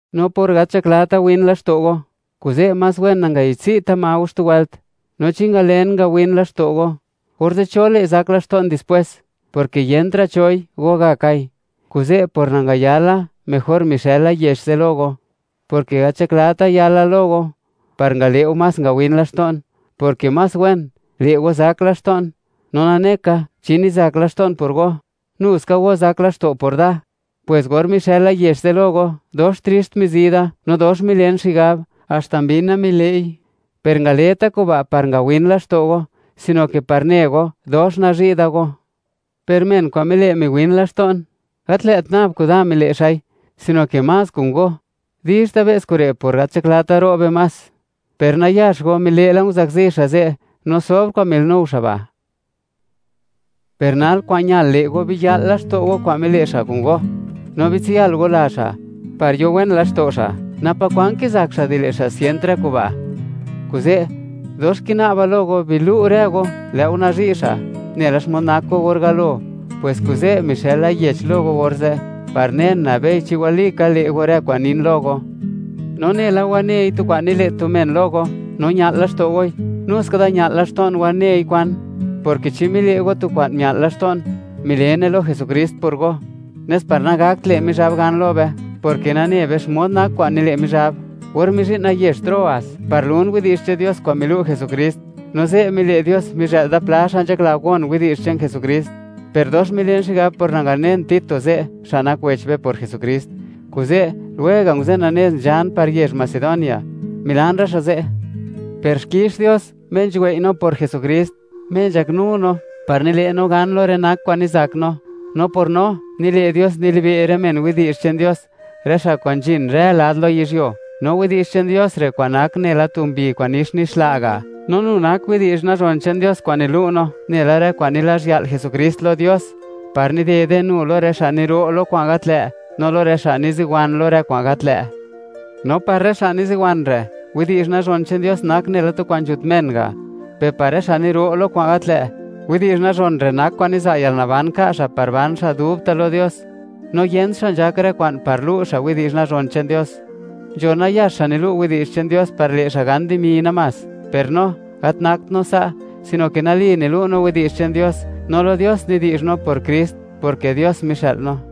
No por gat nzhaklata win laxto' go, kuze' más wen nangayi'dtsi'ta ma go xtu wëlt, no chi ngalen, ngawin laxto' go, orze', ¿cho le', zak laxto'n dispwes?, porke yentra' choi, gogakai. Kuze', por nangayala, mejor mixëla yech ze' lo go, porke gat nzhaklata yala lo go, par ngale' go más ngawin laxto'n, porke más wen, le' go zak laxto'n. No nane ka, chi nizak laxto'n por go, nu ska go zak laxto' go por da. Pwes or mixëla yech ze' lo go, dox trixt mizi da, no dox milen xigab, haxta mbina mile'i. Per ngaleta kuba' par ngawin laxto' go, sino ke par ne go, dox nazhi' da go. Per men kwa'n mile' miwin laxto'n, gat lë't nab kuda mile' xa'i, sino ke más kun go; dizhta' be's kure', por gat nzhaklata ro'be más. Per nayax go mile' la, nguzakzi xa' ze', no sobr kwa'n mile'nuo xa' ba'. Per nal, kwa'n ñal le' go, biya'l laxto' go kwa'n mile' xa' kun go, no bitsiyal go la xa', par yo wen laxto' xa', napa kwan kizak xa' di le' xa' sient rë kuba'. Kuze', dox kina'ba lo go, bilu' rë go, lë' go nazhi' xa', nela xmod nak go, or galo. Pwes kuze' mixëla yech lo go orze', par nen, nabei chi walika, le' go rë kwa'n nin lo go. No nela wanei tu kwan nile' tu men lo go, no ña'l laxto' goi, nu ska da ña'l laxto'n wanei kwa'n, porke chi mile' go tu kwa'n mia'l laxto'n, milene lo Jesukrist por go, nes par nagakt le' Mizhab gan lo be; porke nane be xmod nak kwa'n nile' Mizhab. Or mizhi'na yezh Troas par lun widi'zh che'n Dios kwa'n milu' Jesukrist, no ze' mile' Dios, mizhë'l da pla xa' nzhakla gon widi'zh che'n Jesukrist, per dox milen xigab por nanganen Tito ze', xa' nak wech be por Jesukrist; kuze', lwega' nguzena nez, nzhan par yezh Macedonia, milan rë xa' ze'. Per xkix Dios, Me nzhuwei' no por Jesukrist, Me nzhaknu no par nile' no gan lo rë nak kwa'n nizak no; no por no, nile' Dios, nilibe' rë men widi'zh che'n Dios, rë xa' kwa'n nzhin rë lad lo yizhyuo. No widi'zh che'n Dios re' kwa'n nak nela tu mbi kwa'n nix nixla' ga', no nu nak widi'zh nazhon che'n Dios kwa'n nilu' no nela rë kwa'n nilazhya'l Jesukrist lo Dios, par nidede nu lo rë xa' niro' lo kwa'n gat lë'; no lo rë xa' niziwan lo rë kwa'n gat lë'. No par rë xa' niziwan re', widi'zh nazhon che'n Dios nak nela tu kwa'n nzhut men ga'; per par rë xa' niro' lo kwa'n gat lë', widi'zh nazhon re' nak kwa'n niza' yalnaban ka' xa' par ban xa' dubta' lo Dios. No yent xa' nzhak rë kwa'n, par lu' xa' widi'zh nazhon che'n Dios. Nzho nayax xa' nilu' widi'zh che'n Dios par le' xa' gan dimi namás; per no, gat nakt no sa', sino ke nali nilu' no widi'zh che'n Dios, no lo Dios nidi'zh no por Krist, porke Dios mixë'l no.